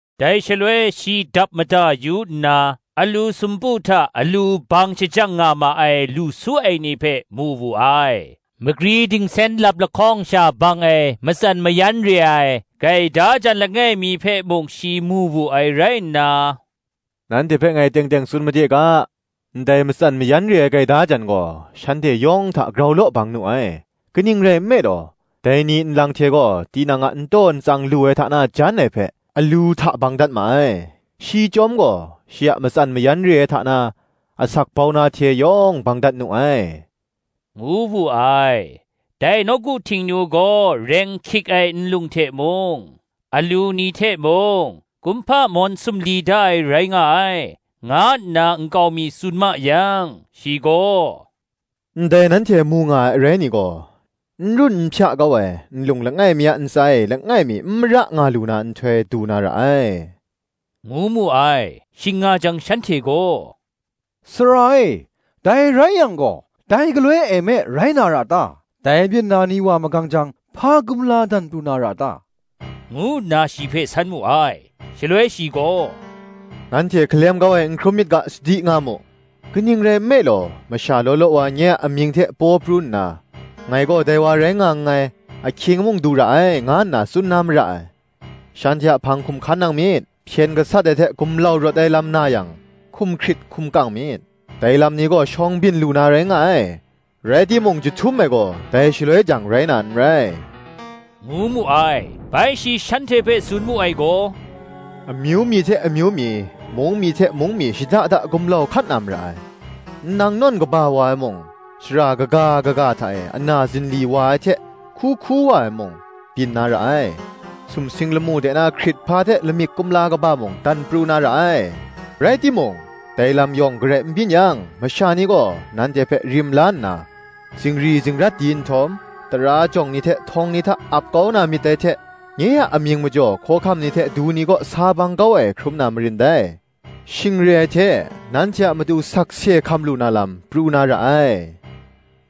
Dai shaloi shi dap mada yu nna, alu sumpu hta alu bang shajang nga ma ai lu su ai ni hpe mu wu ai. Magri dingsen lap lahkawng sha bang ai matsan mayan re ai gaida jan langai mi hpe mung shi mu wu ai rai nna, “Nanhte hpe ngai teng teng tsun made ga, ndai matsan mayan re ai gaida jan gaw, shanhte yawng hta grau law bang nu ai: kaning rai nme law, dai ni nlang hte gaw tinang a n taw n tsang lu ai hta na jan ai hpe, alu hta bang dat ma ai: shi chyawm gaw, shi a matsan mayan re ai hta na asak bau na hte yawng bang dat nu ai,” ngu wu ai. Dai nawku Htingnu gaw reng hkik ai nlung hte mung, alu ni hte mung, kumhpa mawn sumli da ai rai nga ai, nga nna nkau mi tsun ma yang, shi gaw, “Ndai nanhte mu nga ai arai ni gaw, n run n hpya kau ai, nlung langai mi a ntsa e langai mi n mara nga lu na nhtoi du na ra ai,” ngu mu ai. Shing nga jang shanhte gaw, “Sara e, dai rai yang gaw, dai galoi e me rai na ra ta? dai byin na ni wa magang jang, hpa kumla dan pru na ra ta?” ngu nna shi hpe san mu ai. Shaloi shi gaw, “Nanhte hkalem kau ai n hkrum myit ga, sadi nga mu: kaning rai nme law, masha law law wa nye a amying hte paw pru nna, ‘Ngai gaw dai wa rai nga nngai, ahkying mung du ra ai,’ nga nna tsun na mara ai: shanhte a hpang hkum hkan nang myit. Hpyen gasat ai hte gumlau rawt ai lam na yang, hkum hkrit hkum kang myit: dai lam ni gaw shawng byin lu na rai nga ai: rai timung, jahtum ai gaw, dai shaloi jang, rai na n rai,” ngu mu ai. Bai shi shanhte hpe tsun mu ai gaw, “Amyu mi hte amyu mi, mung mi hte mung mi shada da gumlau hkat na mara ai; nnang nawn kaba wa ai mung, shara kaga kaga hta e ana zinli wa ai hte hku hku wa ai mung, byin na ra ai: sumsing lamu de na hkrithpa hte lamik kumla kaba mung dan pru na ra ai. Rai timung, dai lam yawng garai n byin yang, masha ni gaw nanhte hpe rim la nna, zingri zingrat di nhtawm, tara jawng ni hte htawng ni hta ap kau na myit dai hte, nye a amying majaw hkawhkam ni hte du ni kaw sa bang kau ai hkrum na marin dai. Shing re ai hte, nanhte a matu, sakse hkam lu na lam, pru na ra ai.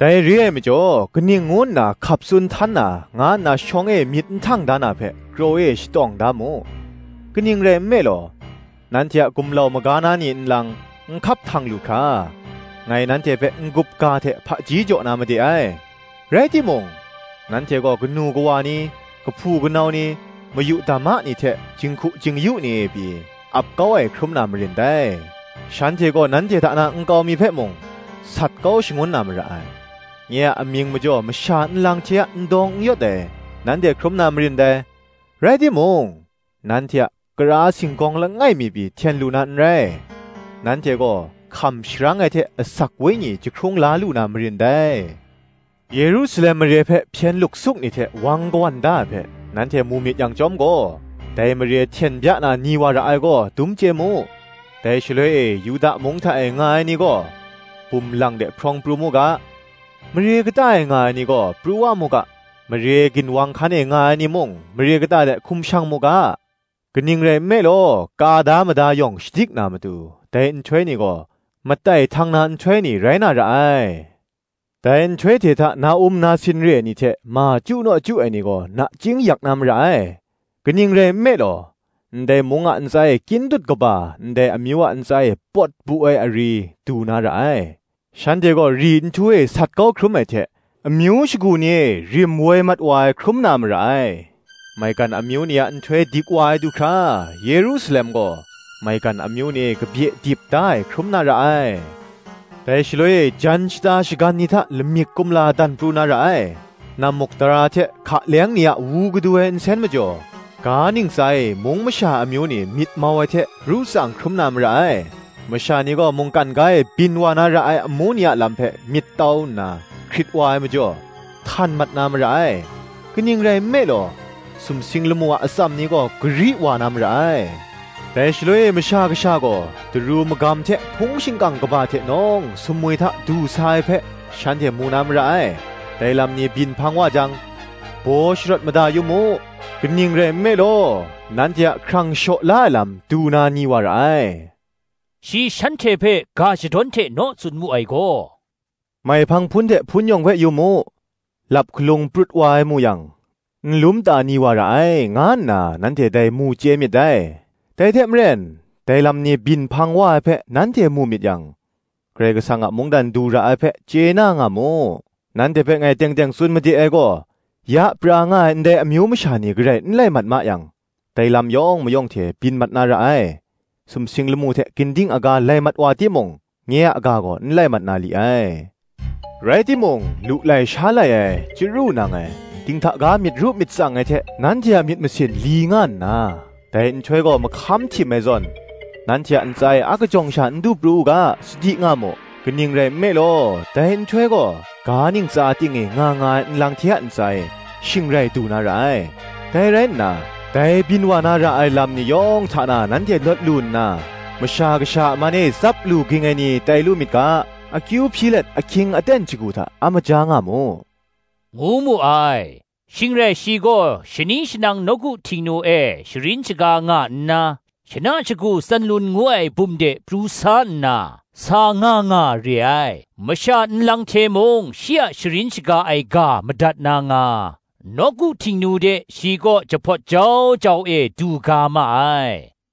Dai re ai majaw, kaning ngu nna hkap tsun htan na, nga nna shawng e myit n htang da na hpe, kraw e shatawng da mu: kaning rai nme law, nanhte a gumlau maga na ni nlang, n hkap htang lu hkra, ngai nanhte hpe n-gup ga hte hpaji jaw na made ai. Rai timung, nanhte gaw kanu kawa ni kahpu kanau ni, mayu dama ni hte jinghku jing-yu ni e pyi, ap kau ai hkrum na marin dai: shanhte gaw nanhte hta na nkau mi hpe mung, sat kau shangun na mara ai: nye a amying majaw masha nlang hte a n dawng n yawt ai, nanhte hkrum na marin dai. Rai timung, nanhte a kara singgawng langai mi pyi, hten lu na n rai. Nanhte gaw hkam sharang ai hte asak wenyi jahkrung la lu na marin dai. Yerusalem mare hpe hpyen luksuk ni hte wang kawan da ai hpe, nanhte mu myit yang chyawm gaw, dai mare hten bya na, ni wa ra ai gaw, dum chye mu. Dai shaloi e, Yuda mung hta e nga ai ni gaw, bum lang de hprawng pru mu ga; mare kata e nga ai ni gaw, pru wa mu ga; mare ginwang hkan e nga ai ni mung, mare kata de hkum shang mu ga: kaning rai nme law, ka da mada yawng shadik na matu, dai nhtoi ni gaw, matai htang na nhtoi ni rai na ra ai. Dai nhtoi hte hta na-um na sin re ai ni hte ma chyu naw chyu ai ni gaw nachying yak na mara ai; kaning rai nme law, ndai mung a ntsa e kyin dut kaba, ndai amyu a ntsa e pawt bu ai ari, du na ra ai. Shanhte gaw ri nhtu e sat kau hkrum ai hte, amyu shagu ni e rim woi mat wa ai hkrum na mara ai: maigan amyu ni a nhtoi dik wa ai du hkra, Yerusalem gaw maigan amyu ni e kabye dip da ai hkrum na ra ai. Dai shaloi e jan, shata, shagan ni hta lamik kumla dan pru na ra ai, nammukdara hte hka leng ni a wu kadu ai nsen majaw, ga ntsa e, mung masha amyu ni myit mau ai hte ru tsang hkrum na mara ai: masha ni gaw mungkan ga e byin wa na ra ai amu ni a lam hpe myit tau nna hkrit wa ai majaw, htan mat na mara ai: kaning rai nme law, sumsing lamu a atsam ni gaw gari wa na mara ai. Dai shaloi e Masha Kasha gaw, daru magam hte hpung shingkang kaba hte nawng sumwi hta du sa ai hpe, shanhte mu na mara ai. Dai lam ni byin hpang wa jang, baw sharawt mada yu mu: kaning rai nme law, nanhte a hkrang shaw la ai lam du na ni wa ra ai.” Shi shanhte hpe ga shadawn hte naw tsun mu ai gaw, “Maihpang hpun hte, hpun yawng hpe yu mu: lap hkalung prut wa ai mu yang, nlum ta ni wa ra ai, nga nna nanhte dai mu chye myit dai. Dai hte maren, dai lam ni byin hpang wa ai hpe nanhte mu myit yang, Karai Kasang a mungdan du ra ai hpe, chye na nga mu. Nanhte hpe ngai teng teng tsun made ai gaw, Ya pra nga ai ndai amyu masha ni garai n lai mat ma yang, dai lam yawng mayawng hte byin mat na ra ai. Sumsing lamu hte ginding aga lai mat wa timung, nye a ga gaw n lai mat na li ai. Rai timung, lu lai sha lai ai, chyaru nang ai, dinghta ga myit ru myit tsang ai hte nanhte a myit masin li nga nna, dai nhtoi gaw mahkam htim ai zawn, nanhte a ntsa e akajawng sha n du pru u ga, sadi nga mu: kaning rai nme law, dai nhtoi gaw ga ntsa ting e nga nga ai ni nlang hte a ntsa e, shing rai du na ra ai. Dai rai nna, dai byin wa na ra ai lam ni yawng hta na nanhte lawt lu nna, Masha Kasha a man e tsap lu ging ai ni tai lu myit ga, akyu hpyi let, ahkying aten shagu hta a maja nga mu,” ngu mu ai. Shing rai shi gaw shani shanang nawku Htingnu e sharin shaga nga nna, shana shagu Tsanlun ngu ai bum de pru sa nna, sa nga nga re ai. Masha nlang hte mung shi a sharin shaga ai ga madat na nga, nawku Htingnu de shi kaw jahpawt jau jau e du ga ma ai.